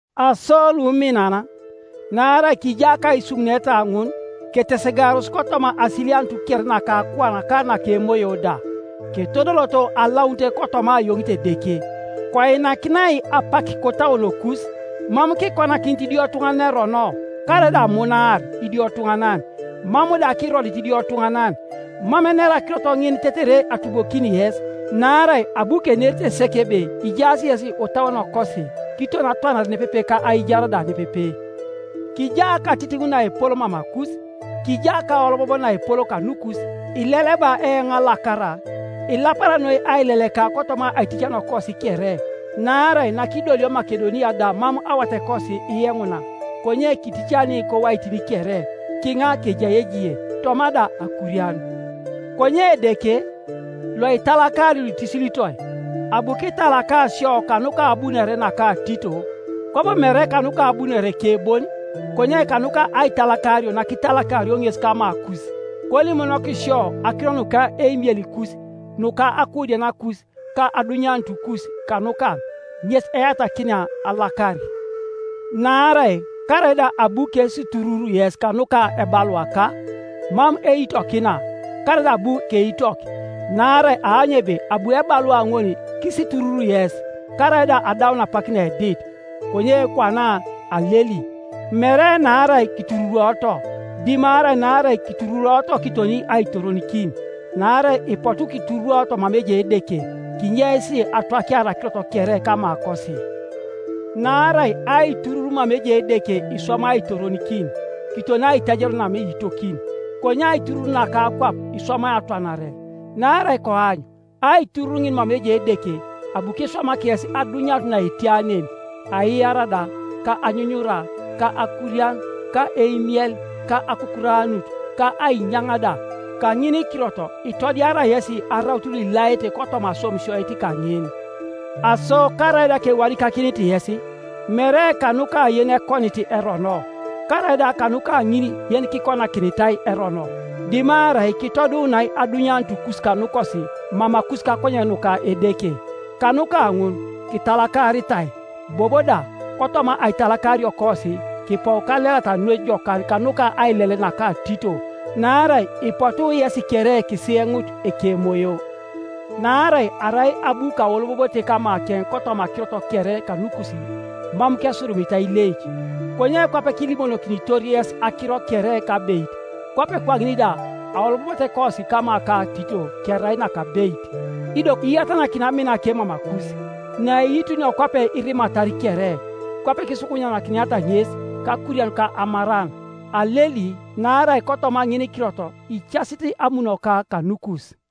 Aso luminan, naarai kija kaisumuneta ŋun, ketesegaaros kotoma asilianut kere naka akuan ka naka emoyo da, ketodoloto alaunit kotoma ayoŋit Edeke. Koinakinai apak kotauonokus; mam kikonakinit idiotuŋanan erono, karaida amunaar idiotuŋanan, mam da kirodit idiotuŋanan. Mam enera akirot ŋin tetere atubokini yes, naarai abu kenerite sek ebe ijaas yes otauonokosi, kiton atwanare nepepe ka aijar da nepepe. Kija katitiŋ naepol mamakus; kija kaolobob naepol kanukus; ileleba eoŋ alakara. Ilapara noi aileleka kotoma aiticaniokos kere. Naarai nakidolio Makedonia da mam awatekosi iyeŋuna, konye kiticani kowaitin kere-kiŋa kejai ejie, toma da akurian. Konye Edeke, loitalakari luitisilitoi, abu kitalaka sio kanuka abunore naka Tito; kwabo mere kanuka abunoreke bon, konye kanuka aitalakario nakitalakario ŋes kamakus, kolimonok sio akiro nuka eimielikus, nuka akuudianakus, ka adunyanutukus kanukaŋ, ŋes eyatakinia alakar. Naarai karaida abu kesiturur yes kanuka ebaluaka, mam eitokina, (karaida abu keitok,) naarai aany ebe abu ebalua ŋol kisiturur yes, karaida adaun apak naedit. Konye kwana aleli, mere naarai kitururuoto, dimarai naarai kitururuoto kiton aitoronikin; naarai ipotu kitururuoto mama ejai Edeke, kinyeis atwakiar akirot kere kamakosi. Naarai aiturur mama ejai Edeke iswamai aitoronikin, kiton aitajario namam iitokin, konye aiturur naka akwap iswamai atwanare. Naarai koany aiturur ŋin mama ejai Edeke abu kiswamak yes adunyanut naetia nen, aiyara da, ka anyunyura, ka akurian, ka eimiel, ka akukuranut, ka ainyaŋ da. Kaŋinikirot itodiara yesi araut luilaete kotoma aswamisioit kaŋin, Aso karaida kewadikakinit yes, mere kanuka yenekonit erono, karaida kanuka ŋin yenikikonakinitai erono, dimarai kitoduunai adunyanutukus kanukosi mamakus kakonyen nuka Edeke. Kanuka ŋun kitalakaritai. Bobo da kotoma aitalakariokosi kipou kalelata noi jokan kanuka aile! naka Tito, naarai ipotu yesi kere kisiyenut ekemoyo, Naarai arai abu kaolobobote kamakeŋ kotoma akirot kere kanukus, mam kesurumitai ileic; konye kwape kiilimonokinitor yes akiro kere kabeit, kwape kwaŋin da aolobobotekosi kama ka Tito kerai nakabeit. Ido iyatanakin aminake mamakus, naiitunio kwape irimatar kere, kwape kisukunyikiniata ŋes kakurian ka amaran. Aleli naarai kotoma ŋinikirot icasit amunoka kanukus.